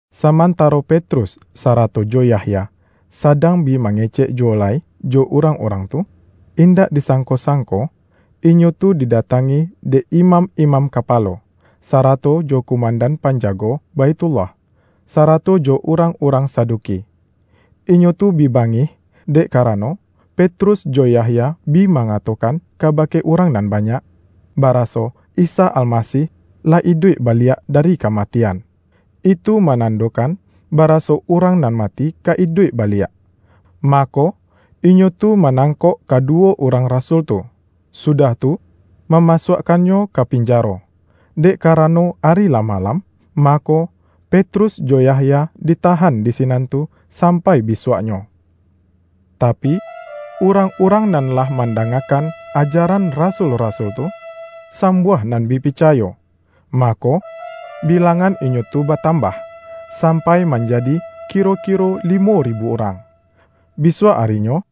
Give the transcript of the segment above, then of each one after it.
Samantaro Petrus sarato jo Yahya, sadang bi mangecek juwo lai jo urang-urang tu, indak disangko-sangko, inyo tu didatangi dek imam-imam kapalo, sarato jo kumandan panjago Baithullah, sarato jo urang-urang Saduki. Inyo tu bi bangih, dek karano, Petrus jo Yahya bi mangatokan kabake urang nan banyak, baraso Isa Almasih lah iduik baliak dari kamatian. Itu manandokan baraso urang nan mati ka iduik baliak. Mako, inyo tu manangkok kaduwo urang rasul tu, sudah tu, mamasuakkannyo ka pinjaro. Dek karano ari lah malam, mako, Petrus jo Yahya ditahan di sinan tu sampai bisuaknyo. Tapi, urang-urang nan lah mandangakan ajaran rasul-rasul tu, sambuah nan bi picayo. Mako, bilangan inyo tu batambah, sampai manjadi kiro-kiro limo ribu urang. Bisuak arinyo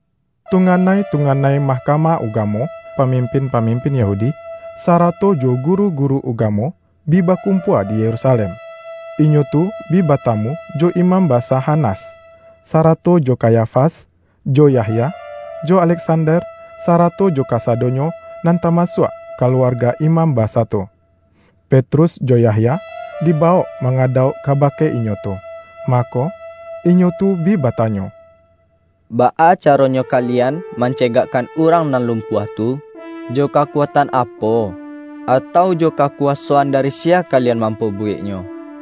tunganai-tunganai Mahkamah Ugamo, pamimpin-pamimpin Yahudi, sarato jo guru-guru ugamo bi bakumpua di Yerusalem. Inyo tu bi batamu jo Imam Basa Hanas, sarato jo Kayafas, jo Yahya, jo Aleksander, sarato jo kasadonyo nan tamasuak kaluarga imam basa tu. Petrus jo Yahya, dibawok mangadauk kabake inyo tu, mako, inyo tu bi batanyo,”Baa caronyo kalian mancegakkan urang nan lumpuah tu? Jo kakuatan apo, atau jo kakuwasoan dari siya kalian mampabuweknyo?”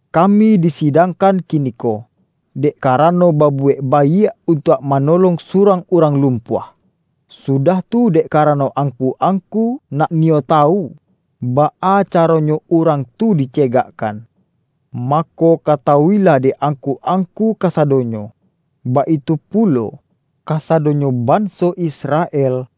Kami disidangkan kiniko, dek karano babuwek baiak untuak manolong surang urang lumpuah, sudah tu, dek karano angku-angku nak niyo tawu baa caronyo urang tu dicegakkan. Mako, katawu-ilah dek angku-angku kasadonyo, baitu pulo, kasadonyo banso Israel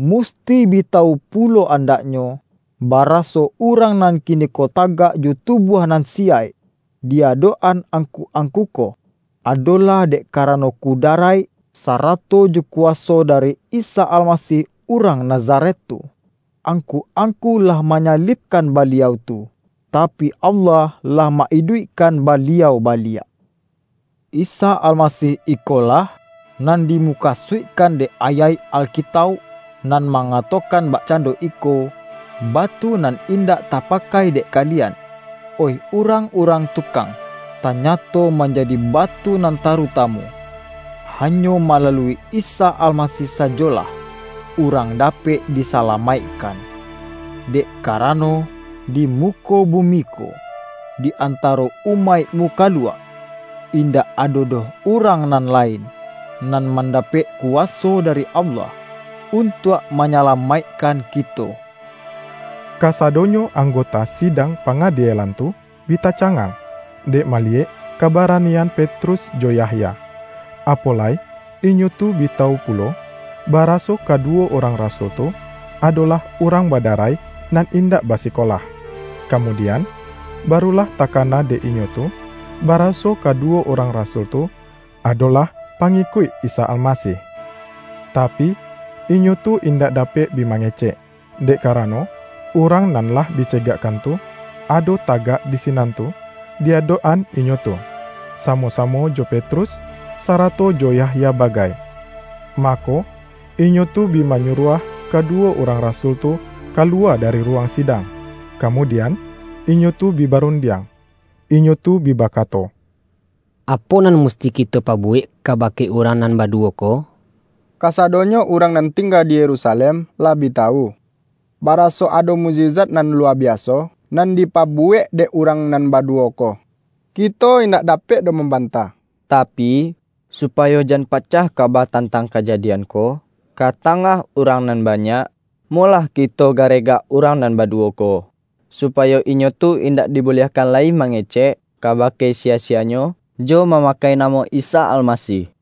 musti bi tawu pulo andaknyo, baraso, urang nan kiniko tagak jo tubuah nan siyaik di adok-an angku-angku ko, adolah dek karano kudaraik, sarato jo kuwaso dari Isa Almasih urang Nazaret tu. Angku-angku lah manyalibkan Baliau tu, tapi, Allah lah ma-iduikkan Baliau baliak. Isa Almasih ikolah, nan dimukasuikkan dek ayaik Alkitauk nan mangatokan bakcando iko, ’Batu nan indak tapakai dek kalian, oih urang-urang tukang, tanyato manjadi batu nan tarutamu.’ Hanyo malalui Isa Almasih sajolah urang dapek disalamaikkan. Dek karano, di muko bumi ko di antaro umaik mukaluak, indak ado doh urang nan lain, nan mandapek kuwaso dari Allah, untuak manyalamaikkan kito.” Kasadonyo anggota Sidang Panga-dielan tu bi tacangang, dek maliyek kabaranian Petrus jo Yahya, apo lai inyo tu bi tawu pulo, baraso kaduwo urang rasul tu, adolah urang badarai nan indak basikola. Kamudian, barulah takana dek inyo tu baraso kaduwo urang rasul tu adolah pangikuik Isa Almasih. Tapi, inyo tu indak dapek bi mangecek, dek karano urang nan lah dicegakkan tu, ado tagak di sinan tu di adok-an inyo tu, samo-samo jo Petrus, sarato jo Yahya bagai. Mako, inyo tu bi manyuruah kaduwo urang rasul tu kaluwa dari ruwang sidang, kamudian, inyo tu bi barundiang. Inyo tu bi bakato,”Apo nan musti kito pabuwek kabake urang nan baduwo ko? Kasadonyo urang nan tingga di Yerusalem lah bi tawu, baraso ado mukjizat nan luwa biaso, nan dipabuwek dek urang nan baduwo ko. Kito indak dapek doh mambantah. Tapi, supayo jan pacah kaba tantang kajadian ko, ka tangah urang nan banyak, molah kito garegak urang nan baduwo ko, supayo inyo tu indak dibuliahkan lai mangecek kabake siya-siyanyo, jo mamakai namo Isa Almasih.”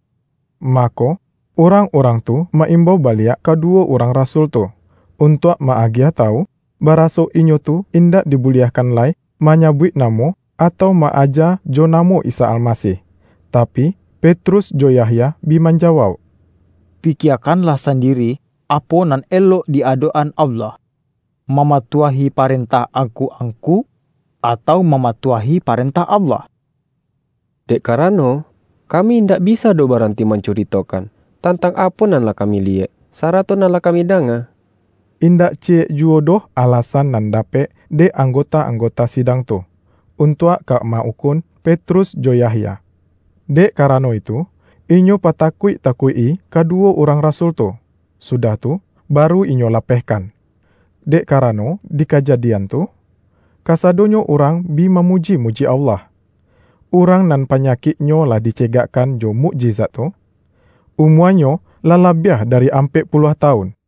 Mako, urang-urang tu ma-imbau baliak kaduwo urang rasul tu, untuak ma-agiah tawu, baraso inyo tu indak dibuliahkan lai manyabuik namo, atau ma-aja jo namo Isa Almasih. Tapi, Petrus jo Yahya bi manjawauk,”Pikiekanlah sandiri, apo nan elok di adok-an Allah: mamatuahi parentah angku-angku atau mamatuahi parentah Allah. Dek karano, kami indak bisa doh baranti mancuritokan, tantang apo nan lah kami liyek, sarato nan lah kami danga.” Indak ciyek juwo doh alasan nan dapek dek anggota-anggota sidang tu, untuak ka ma-ukun Petrus jo Yahya. Dek karano itu, inyo patakuik-takuik-i kaduwo urang rasul tu, sudah tu, baru inyo lapehkan, dek karano di kajadian tu, kasadonyo urang bi mamuji-muji Allah. Urang nan panyakiknyo lah dicegakkan jo mukjizat tu, umuanyo lah labiah dari ampek puluah tawun.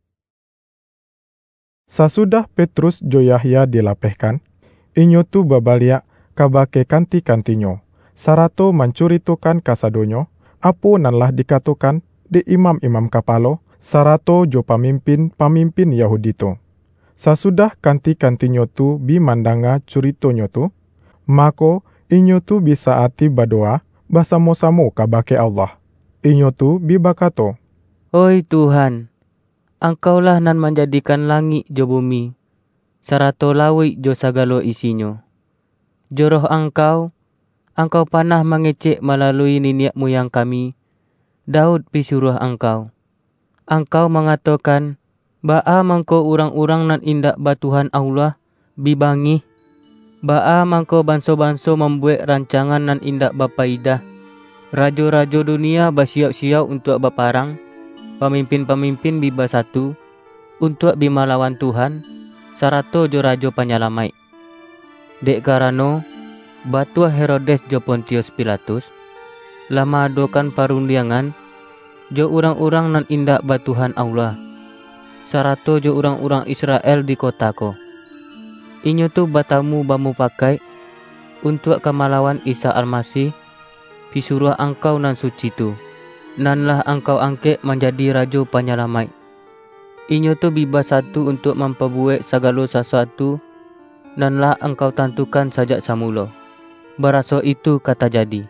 Sasudah Petrus jo Yahya dila-pehkan, inyo tu babaliak kabake kanti-kantinyo, sarato mancuritokan kasadonyo, apo nan lah dikatokan dek imam-imam kapalo, sarato jo pamimpin-pamimpin Yahudi tu. Sasudah kanti-kantinyo tu bi man-danga curitonyo tu, mako, inyo tu bi sa-ati badowa basamo-samo kabake Allah. Inyo tu bi bakato,”Oih Tuhan, Angkau-lah nan manjadikan langik jo bumi, sarato lauik jo sagalo isinyo. Jo Roh Angkau, Angkau panah mangecek malalui niniak muyang kami, Daud pisuruah Angkau; Angkau mangatokan, ’Baa mangko urang-urang nan indak ba Tuhan Allah, bi bangih; baa mangko banso-banso mambuwek rancangan nan indak bapayidah? Rajo-rajo dunia basiyauk-siyauk untuak baparang, pamimpin-pamimpin bi basatu, untuak bi malawan Tuhan, sarato jo Rajo Panyalamaik.’ Dek karano, batua Herodes jo Pontius Pilatus, lah ma-adokan parundiangan, jo urang-urang nan indak ba Tuhan Allah, sarato jo urang-urang Israel di kota ko. Inyo tu batamu bamupakaik, untuak ka malawan Isa Almasih, Pisuruah Angkau nan suci tu, nan lah Angkau angkek manjadi Rajo Panyalamaik. Inyo tu bi basatu untuak mampabuwek sagalo sasuatu, nan lah Angkau tantukan sajak samulo, baraso itu ka tajadi.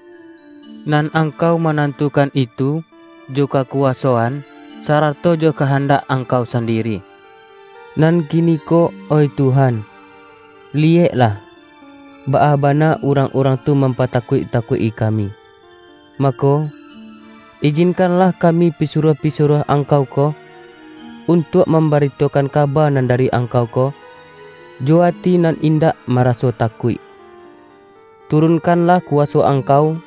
Nan Angkau manantukan itu jo kakuwasoan, sarato jo kahandak Angkau sandiri. Nan kiniko oih Tuhan, liyeklah, baa bana urang-urang tu mampatakuik-takuik-i kami. Mako, ijinkanlah kami pisuruah-pisuruah Angkau ko, untuak mambaritokan kaba nan dari Angkau ko, jo ati nan indak maraso takuik. Turunkanlah kuwaso Angkau,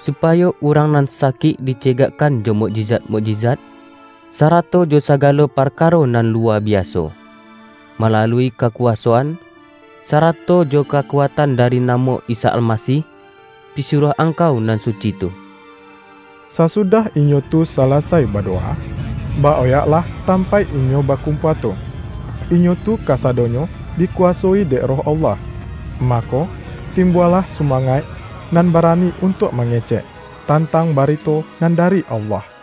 supayo urang nan sakik dicegakkan jo mukjizat-mukjizat, sarato jo sagalo parkaro nan luwa biaso, malalui kakuwasoan, sarato jo kakuatan dari namo Isa Almasih, Pisuruah Angkau nan suci tu.” Sasudah inyo tu salasai badowa, ba-oyaklah tampaik inyo bakumpua tu. Inyo tu kasadonyo dikuwasoi dek Roh Allah, mako, timbualah sumangaik nan barani untuak mangecek, tantang barito nan dari Allah.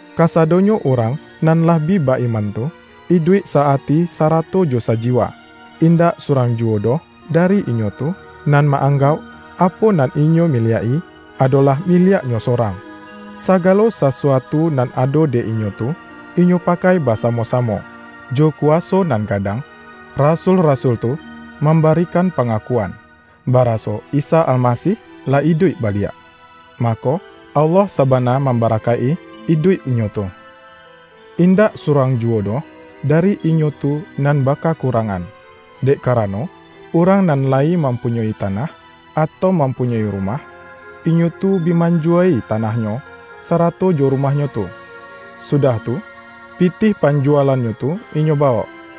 Kasadonyo urang nan lah bi ba-iman tu, iduik sa-ati sarato jo sajiwa. Indak surang juwo doh dari inyo tu, nan ma-anggauk apo nan inyo miliak-i adolah miliaknyo sorang. Sagalo sasuatu nan ado dek inyo tu, inyo pakai basamo-samo. Jo kuwaso nan gadang rasul-rasul tu mambarikan pangakuan, baraso Isa Almasih lah iduik baliak. Mako, Allah sabana mambarakaik-i iduik inyo tu. Indak surang juwo doh dari inyo tu nan bakakurangan. Dek karano, urang nan layi mampunyoi tanah, atau mampunyoi rumah, inyo tu bi manjuwa-i tanahnyo, sarato jo rumahnyo tu; sudah tu, pitih panjuwalannyo tu inyo bawok,